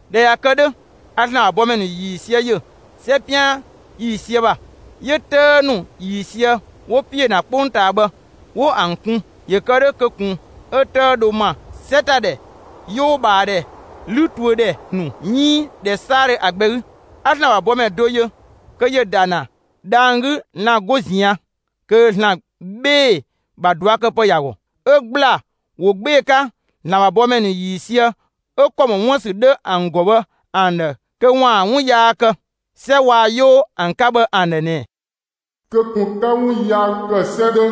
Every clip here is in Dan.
꞊Dhɛ ꞊ya kë 'dhö, a ‑Zlan ‑bha bɔmɛ ‑nu ‑yiisië ‑yö 'sɛ 'pian ‑yiisië ‑bha. 'Yö 'tëë ‑nu ‑yiisië 'wo ‑piö ‑na 'kpongtaa bhë, 'wo ‑an kun ‑yö kë 'dhö kö ꞊kun 'ö 'tëë dho ‑ma 'sɛ ‑ta ‑dhɛ, 'yoo ꞊bhaa ‑dhɛ, 'lü tuö ‑dhɛ ‑nu 'iin ‑dhɛ 'saadhö ‑a gbɛ 'gü. 'A ‑Zlan ‑bha bɔmɛ do yö kö ‑yö ‑da ‑na dhang‑ 'gü lan‑ 'go ꞊zian' kö ‑Zlan 'bhee‑ ‑bha ꞊duakëpë ‑ya ‑gɔ. 'Ö ‑gbla ‑wo 'gbee‑ 'ka ‑Zlan ‑bha bɔmɛ ‑nu ‑yiisië 'ö ‑kɔ ‑mɔ 'wuën‑ ‑sü 'dhö ‑an ‑gɔ bhë ‑an ‑dhë kö ‑waan 'wun yaa kë 'sɛ waa‑ 'yoo ‑an 'ka bhë ‑an ‑dhë ꞊nɛ: «Kö ꞊kun 'ka 'wun yaa ‑kë 'sɛ 'dhö,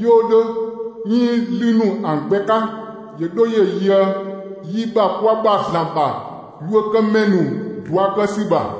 'yoo 'dhö 'iin 'lü ‑nu ‑an gbɛ 'ka, ‑yö 'dho ‑yö yöë yi ‑bha kwa ‑bha ‑Zlan ‑bha yuökëmɛ ‑nu ‑bha ꞊dua' kë ‑sü ‑bha!»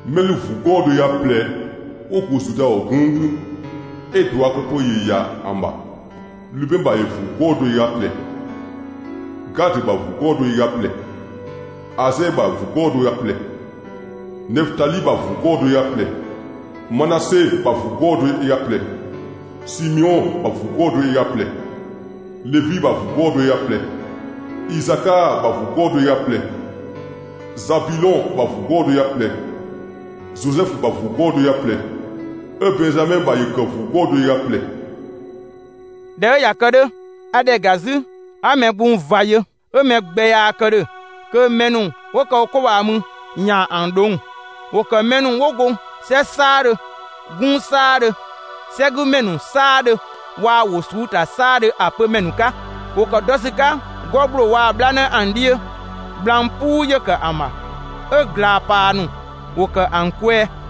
Mɛ ‑lü ‑vuu 'gɔɔ‑ do ö ga ꞊plɛ 'wo go Zuda ‑gɔ 'gunng 'gü 'ö ꞊duakëpë ‑yö ‑ya ‑an ‑bha; Lubɛn ‑bha ‑vuu 'gɔɔ‑ do ö ga ꞊plɛ, Gadö ‑bha ‑vuu 'gɔɔ‑ do ö ga ꞊plɛ, Asɛɛ ‑bha ‑vuu 'gɔɔ‑ do ö ga ꞊plɛ, Nefötali ‑bha ‑vuu 'gɔɔ‑ do ö ga ꞊plɛ, Manase ‑bha ‑vuu 'gɔɔ‑ do ö ga ꞊plɛ, Simeɔn ‑bha ‑vuu 'gɔɔ‑ do ö ga ꞊plɛ, Levi ‑bha ‑vuu 'gɔɔ‑ do ö ga ꞊plɛ, Isakaa ‑bha ‑vuu 'gɔɔ‑ do ö ga ꞊plɛ, Zabilɔn ‑bha ‑vuu 'gɔɔ‑ do ö ga ꞊plɛ, Zozɛfu ‑bha ‑vuu 'gɔɔ‑ do ö ga ꞊plɛ, 'ö Bɛnzamɛ ‑bha ‑yö kë ‑vuu 'gɔɔ‑ do ö ga ꞊plɛ. ꞊Dhɛ 'ö ꞊ya kë 'dhö, a ‑dhɛ ‑ga 'zü 'a mɛ gbung ꞊va yö: 'Ö mɛ gbɛ yaa kë ‑dhö kö mɛ ‑nu 'wo ‑kë wo 'ko ꞊bhaa mü ‑yaan ‑an ꞊dhong'‑. ‑Wo ‑kë mɛ ‑nu 'wo go 'sɛ 'saadhö, 'gunng 'saadhö, 'sɛgümɛ ‑nu 'saadhö waa‑ wo ꞊suu'‑ ‑ta 'saadhö ‑a pö ‑mɛ ‑nu 'ka. ‑Wo ‑kë dɔ ‑sü 'ka 'gɔ ‑gbloo waa‑ 'bhlanë ‑an 'dhiö; gblang 'puu ‑yö ‑kë ‑an ‑bha, 'ö ꞊glaa‑ ‑paa ‑nu ‑wo ‑kë ‑an kwɛɛ.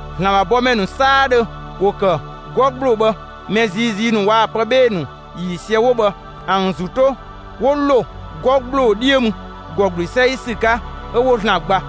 ‑Zlan ‑bha bɔmɛ ‑nu 'saadhö ‑wo ‑kë 'gɔ ‑gbloo bhë, mɛ ziizii ‑nu waa‑ pë 'bhee‑ ‑nu ‑yiisië 'wo bhë ‑an ‑zü 'to 'wo ‑lo 'gɔ ‑gbloo 'dhiö mü ‑gɔ ‑gblü 'sɛi ‑sü 'ka 'ö 'wo ‑Zlan gba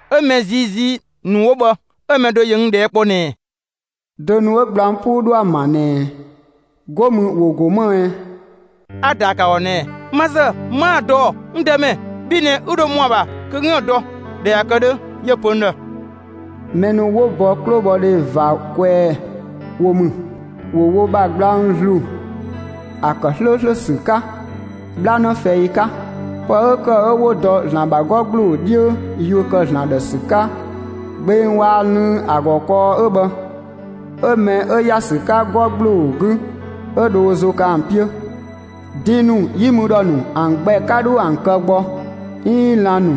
'Ö mɛ ziizii ‑nu 'wo bhë 'ö‑ mɛ do ‑yö n ꞊dhɛɛ' kpɔ ꞊nɛɛ: «Dö ‑nu 'ö gblang 'puu ‑nu 'dho ‑an ‑bha ꞊nɛɛ, 'go mü ‑wo ‑go më ꞊ɛ?» 'A‑ ‑daa ‑kë ‑a ‑gɔ ꞊nɛɛ: «Ma ‑zë 'maa‑ dɔ ‑ɔ, n Dëmɛ; bhi ꞊nɛ 'ü dho ‑mɔa ‑bha kö 'üën‑ dɔ.» ꞊Dhɛ ꞊ya kë 'dhö, 'yö‑ pö n ‑dhë: Mɛ ‑nu 'wo bɔ 'klobhɔdhe ꞊va kwɛɛ wo ‑mü. ‑Wo wo ‑bha gblang ‑zlu ‑a ‑kë 'slööslö ‑sü 'ka 'bhlanë fɛi 'ka. Pë 'ö ‑kë 'ö 'wo dɔ ‑Zlan ‑bha 'gɔ ‑gbloo 'dhiö, yuö ‑kë ‑Zlan ‑dhë ‑sü 'ka gbeng waa‑ lënng ‑a ‑gɔ kɔɔ 'ö bhë, 'ö mɛ 'ö ‑ya ‑sü 'ka 'gɔ ‑gbloo 'gü 'ö dho ö ‑zo kë ‑an 'piö. Din ‑nu, 'yi mü ‑dhɔ ‑nu, ‑an gbɛ 'ka 'dho ‑an kë gbɔ; 'iin lan‑ ‑nu,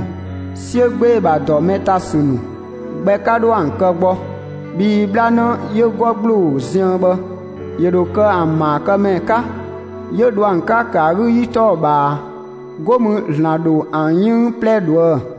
'siö 'gbee‑ ‑bha ‑dɔ mɛ ‑ta ‑sü ‑nu gbɛ 'ka 'dho ‑an kë gbɔ. Bhii 'bhlanë 'yö 'gɔ ‑gbloo ziën bhë ‑yö ‑dho kë ‑an ‑maakëmɛ 'ka, 'yö dho ‑an 'ka ‑kë ‑a 'gü ‑yi 'tɔɔ‑ ꞊bhaa. 'Go mü ‑Zlan ‑dho ‑an 'yënng 'plɛ ꞊dhuë'‑.